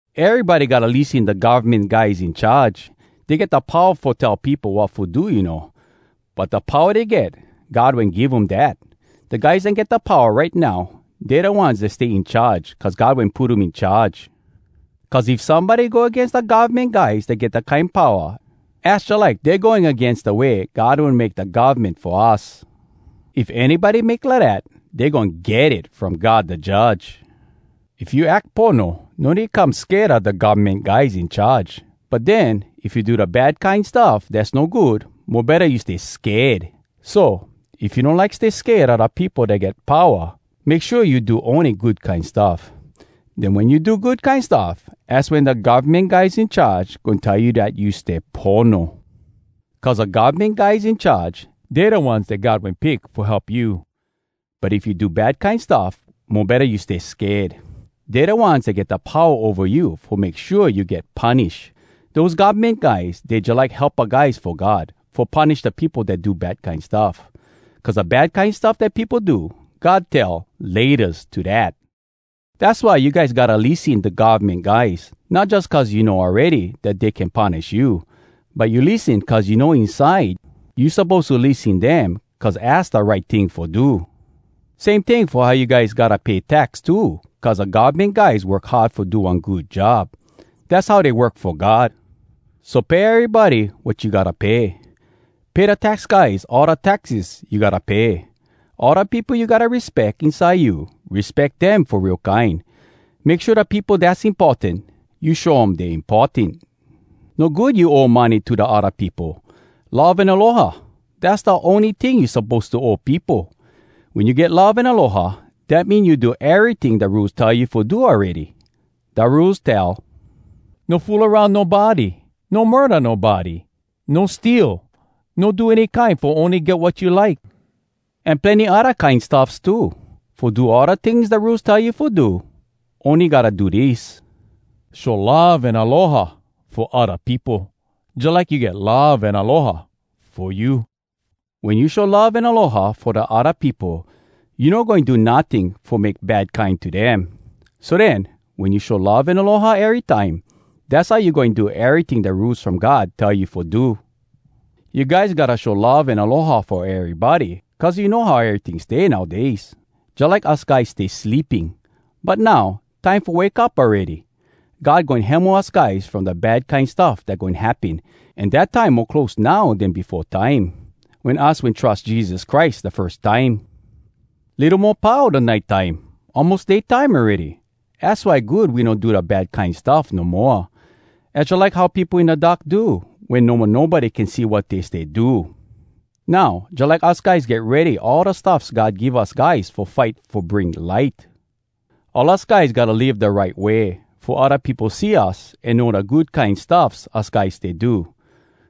Erybody gotta lissen da govmen guys in charge. Dey get da powa fo tell peopo wat fo do, you know. But da powa dey get, God wen give um dat. Da guys dat get powa right now, dey da ones dat stay in charge cuz God wen put um in charge. Cuz if somebody go agains da govmen guys dat get dat kine powa, az jalike dey going agains da way God wen make da govmen fo us. If anybody make lidat, dey goin get it from God da Judge. If you ack pono, no need come sked a da govmen guys in charge. But den, if you do da bad kine stuff dass no good, mo betta you stay sked! So, if you no like stay sked a da peopo dat get powa, make shua you do ony good kine stuff. Den wen you do good kine stuff, az wen da govmen guys in charge goin tell you dat you stay pono. Cuz da govmen guys in charge, dey da ones dat God wen pick fo help you. But if you do bad kine stuff, mo betta you stay sked! Dey da ones dat get da powa ova you fo make shua you get punish. Dose govmen guys, dey jalike helpa guys fo God, fo punish da peopo dat do bad kine stuff. Cuz da bad kine stuff dat peopo do, God tell “Laytas” to dat. Dass why you guys gotta lissen da govmen guys. Not jus cuz you know awready dat dey can punish you. But you lissen cuz you know inside, you suppose to lissen dem cuz az da right ting fo do. Same ting fo how you guys gotta pay tax too cuz da govmen guys work hard fo do one good job. Dass how dey work fo God. So pay erybody wat you gotta pay. Pay da tax guys all da taxes you gotta pay. All da peopo you gotta respeck, inside you, respeck dem fo real kine. Make shua da peopo dass importan, you show um dey importan. No good you owe money to odda peopo. Love an aloha, dass da ony ting you suppose to owe peopo. Wen you get love an aloha, dat mean you do eryting da Rules tell you fo do awready. Da Rules tell, “No fool aroun nobody, no murda nobody, no steal, no do any kine fo ony get wat you like,” an plenny odda kine stuffs too. Fo do all da tings da Rules tell you fo do, ony gotta do dis: “Show love an aloha fo odda peopo jalike you get love an aloha fo you.” Wen you show love an aloha fo da odda peopo, you no goin do notting fo make bad kine to dem! So den, wen you show love an aloha erytime, dass how you goin do eryting da Rules from God tell you fo do. You guys gotta show love an aloha fo erybody cuz you know how eryting stay nowdays. Jalike us guys stay sleeping, but now, time fo wake up awready! God goin hemo us guys from da bad kine stuff dat goin happen, an dat time mo close now den befo time, wen us wen trus Jesus Christ da firs time. Litto mo pau da nite time, almos day time awready! Az why good we no do da bad kine stuff no moa. Az jalike how peopo in da dark do, wen no mo nobody can see wat dey stay do. Now, jalike us guys get ready all da stuffs God give us guys fo fight fo bring light! All us guys gotta live da right way, fo odda peopo see us an know da good kine stuffs us guys stay do.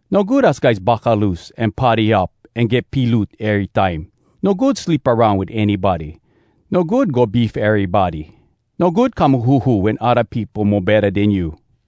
No good us guys buckaloose an party up an get piloot ery time. No good sleep aroun wit anybody. No good go beef erybody. No good come huhu wen odda peopo mo betta den you.